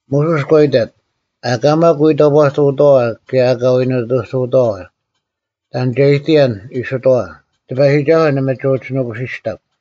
ᒧᓱᔅ ᒂ ᐃᑕᑦ, “ᐊᑲ ᒪᒃ ᐎ ᑕᑈᑐᐅᑥᐛ ᑭᔭ ᐊᑲ ᐎ ᓂᑐᑐᐅᑥᐛ᙮ ᑕᓐ ᒐ ᐃᑎᔭᓐ ᐃᓯᑥᐛ, ‘ᑎᐸᔨᒋᒐᓱᐤ ᓇᒪ ᒋ ᐅᒋ ᓄᑯᓯᔅᑕᒄ᙮’”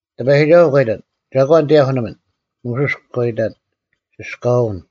ᑎᐸᔨᒋᒐᓱᐤ ᒂ ᐃᑕᑦ, “ᒐᒂᓐ ᑎᔭᐧᑯᓂᒥᓐ?” ᒧᓱᔅ ᒂ ᐃᑕᑦ, “ᓯᔅᑲᐅᓐ᙮”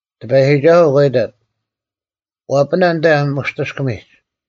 ᑎᐸᔨᒋᒐᓱᐤ ᒂ ᐃᑕᑦ, “ᐛᐱᓇ ᐊᓐᑕ ᒧᔅᑎᔅᑭᒥᒡ᙮”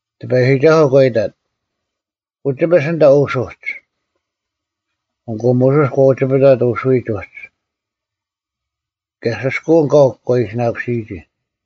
ᑎᐸᔨᒋᒐᓱᐤ ᒂ ᐃᑕᑦ, “ᐅᒋᐱᔅ ᐊᓐᑕ ᐅᓱᒡ᙮” ᐊᑯ ᒧᓱᔅ ᒂ ᐅᒋᐱᑕᑦ ᐅᓱᔨᒡ ᐅᒡ, ᑭᔭ ᓯᔅᑲᐅᓐ ᑲᐤ ᒂ ᐃᓯᓇᑯᓯᔨᒋ᙮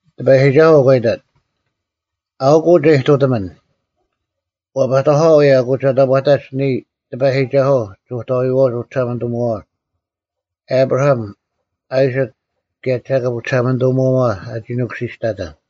ᑎᐸᔨᒋᒐᓱᐤ ᒂ ᐃᑕᑦ, “ᐊᐅᑯᐤ ᒐ ᐃᑐᑎᒥᓐ, ᐛᐸᑕᐧᑲᐛ ᐅᔭ ᐊᑯ ᒐ ᑕᑈᑥᒡ ᓂᔾ, ᑎᐸᔨᒋᒐᓱᐤ, ᒍᑕᐎᐛᐅᒡ ᐅᒋᓴᒪᓂᑐᒧᐛᐛ, ᐊᑉᕋᐊᒻ, ᐊᐃᓯᒃ, ᑭᔭ ᒐᑭᑉ ᐅᒋᓴᒪᓂᑐᒧᐛᐛ, ᐊᒋ ᓄᑯᓯᔅᑕᑕᓐ᙮”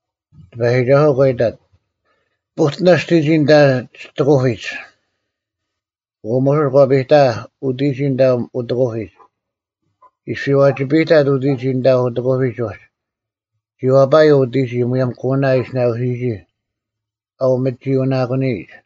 ᑎᐸᔨᒋᒐᓱᐤ ᒂ ᐃᑕᑦ, “ᐳᑎᓇ ᒋᑎᒋᔾ ᐊᓐᑕ ᒋᑦ ᐊᑯᐱᒡ,” ᐊᑯ ᒧᓱᔅ ᒂ ᐱᑕᐊᐧᒃ ᐅᑎᒋᔾ ᐊᓐᑕ ᐅᑦ ᐊᑯᐱᒡ᙮ ᐃᔅᐱ ᐛᒋᐱᔨᑕᑦ ᐅᑎᒋᔾ ᐊᓐᑕ ᐅᑦ ᐊᑯᐱᒡ ᐅᒡ, ᒋ ᐛᐸᔪᐤ ᐅᑎᒋᔾ ᒧᔭᒻ ᑯᓇ ᐊᓯᓇᑯᓯᔨᒋ ᐊᐅᒥᒋᔪᐅᓇᑯᓂᔨᒡ᙮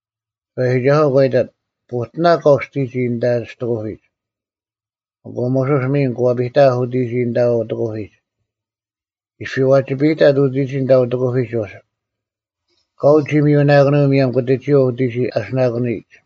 ᑎᐸᔨᒋᒐᓱᐤ ᒂ ᐃᑕᑦ, “ᐳᑎᓇ ᑲᐤ ᒋᑎᒋᔾ ᐊᓐᑕ ᒋᑦ ᐊᑯᐱᒡ᙮” ᐊᑯ ᒧᓱᔅ ᒥᓐ ᒂ ᐱᑕᐊᐧᒃ ᐅᑎᒋᔾ ᐊᓐᑕ ᐅᑦ ᐊᑯᐱᒡ᙮ ᐃᔅᐱ ᐛᒋᐱᔨᑕᑦ ᐅᑎᒋᔾ ᐊᓐᑕ ᐅᑕᑯᐱᒡ ᐅᒡ, ᑲᐤ ᒋ ᒥᔪᓇᑯᓂᔪᐤ ᒧᔭᒻ ᑯᑎᒋᔪᐤ ᐅᑎᒋᔾ ᐊᓯᓇᑯᓂᔨᒡ᙮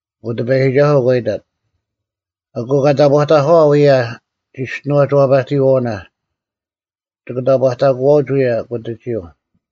ᐊᑯ ᑎᐸᔨᒋᒐᓱᐤ ᒂ ᐃᑕᑦ, “ᐊᑯ ᑲ ᑕᑈᑕᐧᑲᐛ ᐅᔭ ᒋᔅᒋᓄᐛᒡ ᐛᐸᑎᔨᐛᐅᓇ, ᒋᑭ ᑕᑈᑕᑯᐛᐅᒡ ᐅᔭ ᑯᑎᒋᔪᐤ᙮”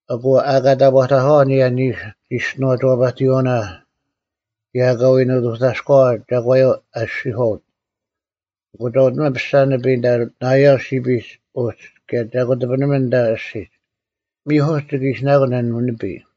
ᐊᑯ ᐊᑲ ᑕᑈᑕᒂᐛ ᐊᓂᔭ ᓂᓱ ᒋᔅᒋᓄᐛᒡ ᐛᐸᑎᔨᐛᐅᓇ ᑭᔭ ᐊᑲ ᐎ ᓂᑐᑕᔎᐛ ᒐᒂᔪᐤ ᐊᔅᒋᔄᐅᑦ, ᐊᑯ ᒐ ᐅᑎᓂᒥᓐ ᐱᔅᒐ ᓂᐱᔾ ᐊᓐᑕ ᓇᐃᔭᓪ ᓯᐱᒡ ᐅᒡ ᑭᔭ ᒐ ᑯᑎᐱᓂᒥᓐ ᐊᓐᑕ ᐊᔅᒋᒡ᙮ ᒥᐧᑯᒡ ᒋᑭ ᐃᓯᓇᑯᓐ ᐊᓐ ᓂᐱᔾ᙮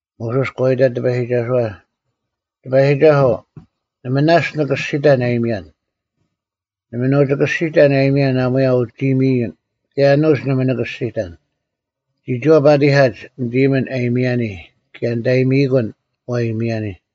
ᒧᓱᔅ ᒂ ᐃᑕᑦ ᑎᐸᔨᒋᒐᓱᐛ, “ᑎᐸᔨᒋᒐᓱᐤ, ᓇᒪ ᓇᔅᒡ ᓂ ᑭᔅᒋᑕᓐ ᐊᔨᒥᔭᓐ᙮ ᓇᒪ ᓂ ᐅᒋ ᑭᔅᒋᑕᓐ ᐊᔨᒥᔭᓐ ᐊᒺᔭ ᐅᒋ ᐃᔨᒥᔨᓐ, ᑭᔭ ᐊᓄᒡ ᓇᒪ ᓂᑭᔅᒋᑕᓐ᙮ ᒋᒋᐛ ᐸᑎᐧᑲᒡ ᓂᑦ ᐃᔨᒥᓐ ᐊ ᐃᔨᒥᔭᓂ ᑭᔭ ᓂᑦ ᐊᔨᒥᐃᑯᓐ ᐛ ᐃᔨᒥᔭᓂ᙮”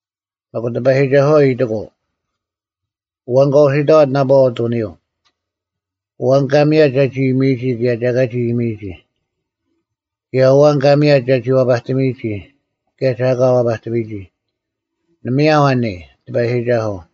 ᒥᒄ ᑎᐸᔨᒋᒐᓱᐛ ᐃᑎᑯᐤ “ᐊᐛᓐ ᑲ ᐅᓯᑕᐛᑦ ᓇᐸᐛ ᐅᑐᓂᔪᐤ? ᐊᐛᓐ ᑲ ᒥᔭᑦ ᒐᒋ ᐃᔨᒥᔨᒋ ᑭᔭ ᒐ ᐊᑲ ᒋ ᐃᔨᒥᔨᒋ? ᑭᔭ ᐊᐛᓐ ᑲ ᒥᔭᑦ ᒐᒋ ᐛᐸᑎᒥᔨᒋ ᑭᔭ ᒐ ᐊᑲ ᐛᐸᑎᒥᔨᒋ? ᓇᒪᔭᐤ ᐊ ᓂᔾ, ᑎᐸᔨᒋᒐᓱᐤ?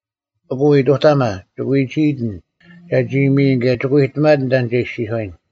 ᐊᑯ ᐃᑐᑕᒪ, ᒋᑭ ᐎᒋᐃᑎᓐ ᒐᒋ ᐃᔨᒥᔨᓐ ᑭᔭ ᒋᑭ ᐎᑎᒪᑎᓐ ᑕᓐ ᒐ ᐃᔅᒋᔄᔨᓐ᙮”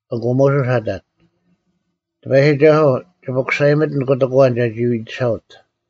ᐊᑯ ᒧᓱᔅ ᐊᑕᑦ, “ᑎᐸᔨᒋᒐᓱᐤ, ᒋ ᐱᑯᓴᔨᒥᑎᓐ ᑯᑎᒃ ᐊᐛᓐ ᒐᒋ ᐃᑎᓴᐅᑦ᙮”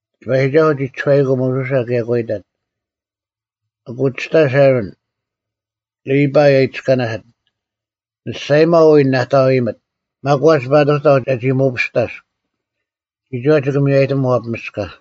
ᑎᐸᔨᒋᒐᓱᐤ ᒋ ᒋᔄᐃᑯᐤ ᒧᓱᓴ ᑭᔭ ᒂ ᐃᑕᑦ, “ᐊᑯ ᒋᔅᑕᔅ ᐊᕋᓐ, ᓕᐸᐃ ᐊ ᐃᑎᔅᑲᓇᓯᑦ? ᓂ ᒋᔅᒐᔨᒪᐤ ᐎᔾ ᓇᑕᐤ ᐃᔨᒥᑦ᙮ ᒪᒂᒡ ᐸᑐᑕᐤ ᒐ ᓇᒋ ᒧᐱᔅᑕᔅᒃ᙮ ᒋᒋᐛ ᒋᑭ ᒥᔽᔨᑎᒻ ᐛᐱᒥᔅᑲ᙮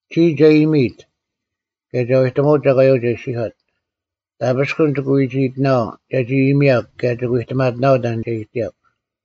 ᒋᔾ ᒐ ᐃᔨᒥᔨᑦ, ᑭᔭ ᒐ ᐎᑎᒧᐅᑦ ᒐᒂᔪᐤ ᒐ ᐃᔅᒋᔄᑦ᙮ ᑕᐱᔅᑯᓐ ᒋᑭ ᐎᒋᐃᑎᓇᐛᐤ ᒐᒋ ᐃᔨᒥᔭᒄ ᑭᔭ ᒋᑭ ᐎᑎᒪᑎᓇᐛᐤ ᑕᓐ ᒐ ᐃᑎᔭᒄ᙮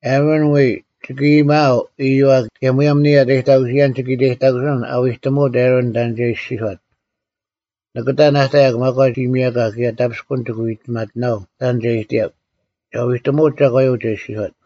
ᐊᕋᓐ ᐎᔾ ᒋᑭ ᐃᔨᒪᐤ ᐃᔪᐛ ᑭᔭ ᒧᔭᒻ ᓂᔾ ᐊᑕᔨᑕᑯᓯᔭᓐ ᒋᑭ ᐃᑕᔨᑕᑯᓯᓐ ᐊᐛᐎᑎᒧᐅᑦ ᐊᕋᓐ ᑕᓐ ᒐ ᐃᔅᒋᔄᑦ᙮ ᓂᑭ ᑕᓐ ᐊᑕᔭᒄ ᒪᒂᒡ ᐃᔨᒥᔭᒂ ᑭᔭ ᑕᐱᔅᑯᓐ ᒋᑭ ᐎᑎᒪᑎᓇᐛᐤ ᑕᓐ ᒐ ᐃᑎᔭᒄ, ᒐ ᐎᑎᒧᐅᑦ ᒐᒂᔪᐤ ᒐ ᐃᔅᒋᔄᑦ᙮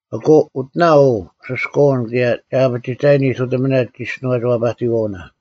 ᐊᑯ ᐅᑎᓇ ᐅ ᓯᔅᑲᐅᓐ ᑭᔭ ᒐ ᐊᐱᒋᑕᔨᓐ ᐃᑐᑎᒥᓇ ᒋᔅᒋᓄᐛᒡ ᐛᐸᑎᑕᐛᐅᓇ᙮”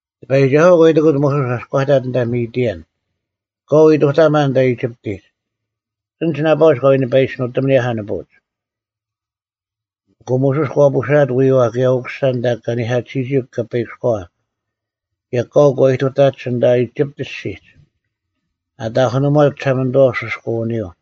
ᑎᐸᔨᒋᒐᓱᐛ ᒂ ᐃᑎᑯᑦ ᒧᓱᔅ ᐊᔅᒄ ᐊᑕᑦ ᐊᓐᑕ ᒥᑎᐊᓐ, “ᑲᐤ ᐃᑐᑕᒪ ᐊᓐᑕ ᐃᒋᑉᑎᒡ, ᐊᓐᒡ ᓇᐸᐅᒡ ᑲ ᐎ ᓂᐸᐃᔅᒡ ᓄᑎᒻ ᐊᓂᔭᐧᑲ ᓂᐳᐅᒡ᙮” ᐊᑯ ᒧᓱᔅ ᒂ ᐳᓴᐊᑦ ᐎᐛ ᑭᔭ ᐅᑯᓴ ᐊᓐᑕ ᑲᓂᐧᑲᑎᓯᔨᒋ ᑲᐸᐃᑭᔎᐛ, ᑭᔭ ᑲᐤ ᒂ ᐃᑐᑕᒡ ᐊᓐᑕ ᐃᒋᑉᑦ ᐊᔅᒋᒡ᙮ ᐊᑕᐧᑯᓂᒺᑦ ᒋᓴᒪᓂᑐᐛ ᐅᓯᔅᑲᐅᓂᔪᐤ᙮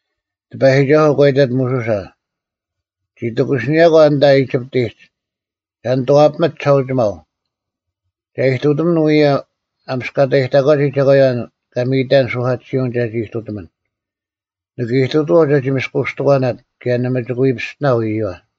ᑎᐸᔨᒋᒐᓱᐤ ᒂ ᐃᑕᑦ ᒧᓱᓴ, “ᒋ ᑎᑯᓯᓂᔭᒂ ᐊᓐᑕ ᐃᒋᑉᑎᒡ, ᒐ ᓂᑐᐛᐱᒥᑦ ᒋᓴᐅᒋᒪᐤ, ᒐ ᐃᑐᑎᒥᓐ ᐅᔭ ᐊᒥᔅᑲᑕᔨᑕᒂᒋ ᒐᒂᔪᐛ ᑲ ᒥᔨᑕᓐ ᓱᐧᑲᑎᓯᐅᓐ ᒐᒋ ᐃᑐᑎᒥᓐ᙮ ᓂᑭ ᐃᑐᑐᐛᐤ ᒐᒋ ᒥᔅᑯᔅᑎᒂᓇᑦ ᑭᔭ ᓇᒪ ᒋᑭ ᐎ ᐱᔅᑎᓇᐤ ᐃᔪᐛ᙮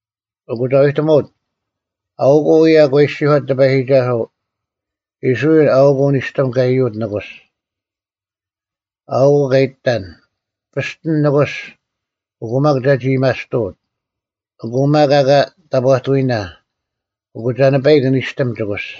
ᐊᑯ ᒐ ᐎᑎᒧᐅᑦ, ‘ᐊᐅᑯᐤ ᐅᔭ ᑲ ᐃᔅᒋᔄᑦ ᑎᐸᔨᒋᒐᓱᐤ, “ᐃᔅᕋᐃᓪ ᐊᐅᒃ ᐅ ᓂᔅᑎᒻ ᑲ ᐃᔪᐅᑦ ᓂᑯᔅ᙮ ᐊᐅᑯᐤ ᑲ ᐃᑎᑕᓐ, “ᐱᔅᑎᓐ ᓂᑯᔅ ᐊᑯ ᒪᒃ ᒐᒋ ᐃᔭᒥᐊᔅᑐᐅᑦ᙮” ᐊᑯ ᒪᒃ ᐊᑲ ᑕᑈᑎᐎᓇ, ᐊᑯ ᒐ ᓂᐸᐃᒃ ᓂᔅᑎᒻ ᒋᑯᔅ᙮”’”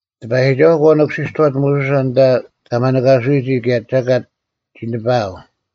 ᑎᐸᔨᒋᒐᓱᐤ ᒂ ᓄᑯᓯᔅᑐᐛᑦ ᒧᓱᓴ ᐊᓐᑕ ᑲ ᒪᓂᑲᓱᐎᒋ ᑭᔭ ᒐᑲᑦ ᒋ ᓂᐸᐊᐤ᙮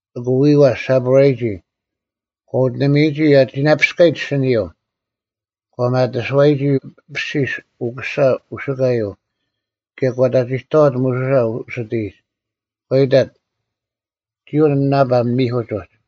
ᐊᑯ ᐎᐛ ᓯᐳᕋᔨᒋ, ᒂ ᐅᑎᓂᒥᔨᒋ ᐊ ᒋᓇᐱᔅᑲᔨᒡ ᐊᓯᓂᔪᐤ ᒂ ᒪᑎᓯᐛᔨᒋ ᐊᐱᓯᔅ ᐅᑯᓴ ᐅᓯᑲᔪᐤ (ᒐᒋ ᒋᔅᒋᓄᐛᒋᔄᑭᓄᐅᑦ) ᑭᔭ ᒂ ᑕᒋᑕᐛᑦ ᒧᓱᓴ ᐅᓯᑎᔨᒡ᙮ ᒂ ᐃᑕᑦ, “ᒋᔾ ᐅ ᓂᓇᐸᒻ ᒥᐧᑯᒡ ᐅᒡ᙮”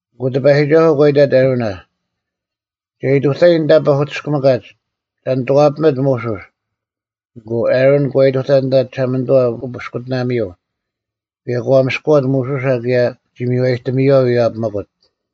ᐊᑯ ᑎᐸᔨᒋᒐᓱᐤ ᒂ ᐃᑕᑦ ᐊᕋᓇ, “ᒐ ᐃᑐᑕᔨᓐ ᐊᓐᑕ ᐸᐧᑯᑎᔅᑭᒥᑲᒡ ᒐ ᓂᑐᐛᐱᒥᑦ ᒧᓱᔅ᙮” ᐊᑯ ᐊᕋᓐ ᒂ ᐃᑐᑕᑦ ᐊᓐᑕ ᒋᓴᒪᓂᑐᐛ ᐅᐱᔅᑯᑎᓇᒥᔪᐤ, ᑭᔭ ᒂ ᒥᔅᑯᐛᑦ ᒧᓱᓴ ᑭᔭ ᒋ ᒥᔽᔨᑎᒥᔪᐛ ᐎᔭᐱᒥᑯᑦ᙮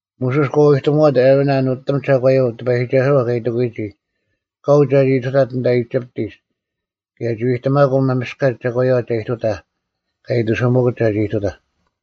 ᒧᓱᔅ ᒂ ᐎᑎᒧᐛᑦ ᐊᕋᓇ ᓄᑎᒻ ᒐᒂᔪᐤ ᑎᐸᔨᒋᒐᓱᐛ ᑲ ᐃᑎᑯᔨᒋ ᑲᐤ ᒐᒋ ᐃᑐᑕᑦ ᐊᓐᑕ ᐃᒋᑉᑎᒡ ᑭᔭ ᒋ ᐎᑎᒪᑯᐤ ᒪᒥᔅᑲᒡ ᒐᒂᔪᐛ ᒐ ᐃᑐᑕᐧᒃ ᑲ ᐃᑎᓱᒥᑯᑦ ᒐᒋ ᐃᑐᑕᐧᒄ᙮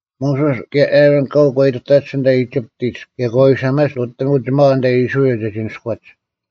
ᒧᓱᔅ ᑭᔭ ᐊᕋᓐ ᑲᐤ ᒂ ᐃᑐᑕᒡ ᐊᓐᑕ ᐃᒋᑉᑎᒡ ᑭᔭ ᒂ ᐎᓴᒪᒡ ᓄᑎᒻ ᐅᒋᒪᐛ ᐊᓐᑕ ᐃᔅᕋᐃᓪ ᒐᒋ ᓇᔅᑯᐛᒡ᙮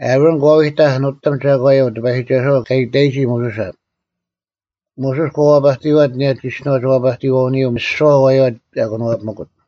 ᐊᕋᓐ ᒂ ᐎᑕᒃ ᓄᑎᒻ ᒐᒂᔪᐤ ᑎᐸᔨᒋᒐᓱᐛ ᑲ ᐃᑕᔨᒋ ᒧᓱᓴ, ᒧᓱᔅ ᒂ ᐛᐸᑎᔨᐛᑦ ᐊᓂᔭ ᒋᔅᒋᓄᐛᒡ ᐛᐸᑎᔨᐛᐅᓂᔪᐤ ᒥᓯᐛ ᐊᐛᔪᐛ ᐊ ᑭᓄᐛᐱᒥᑯᑦ,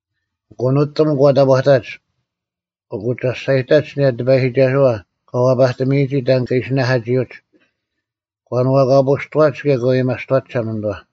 ᐊᑯ ᓄᑎᒻ ᒂ ᑕᑈᑕᒡ᙮ ᐊᑯ ᒐᔅᒐᔨᑕᒡ ᐊᓂᔭ ᑎᐸᔨᒋᒐᓱᐛ ᑲ ᐛᐸᑎᒥᔨᒋ ᑕᓐ ᑲ ᐃᓯ ᓇᐧᑲᒋᐅᒡ, ᒂ ᓄᐛᑲᐳᔅᑐᐛᒡ ᑭᔭ ᒂ ᐊᔭᒥᐊᔅᑐᐛᒡ ᒋᓴᒪᓂᑐᐛ᙮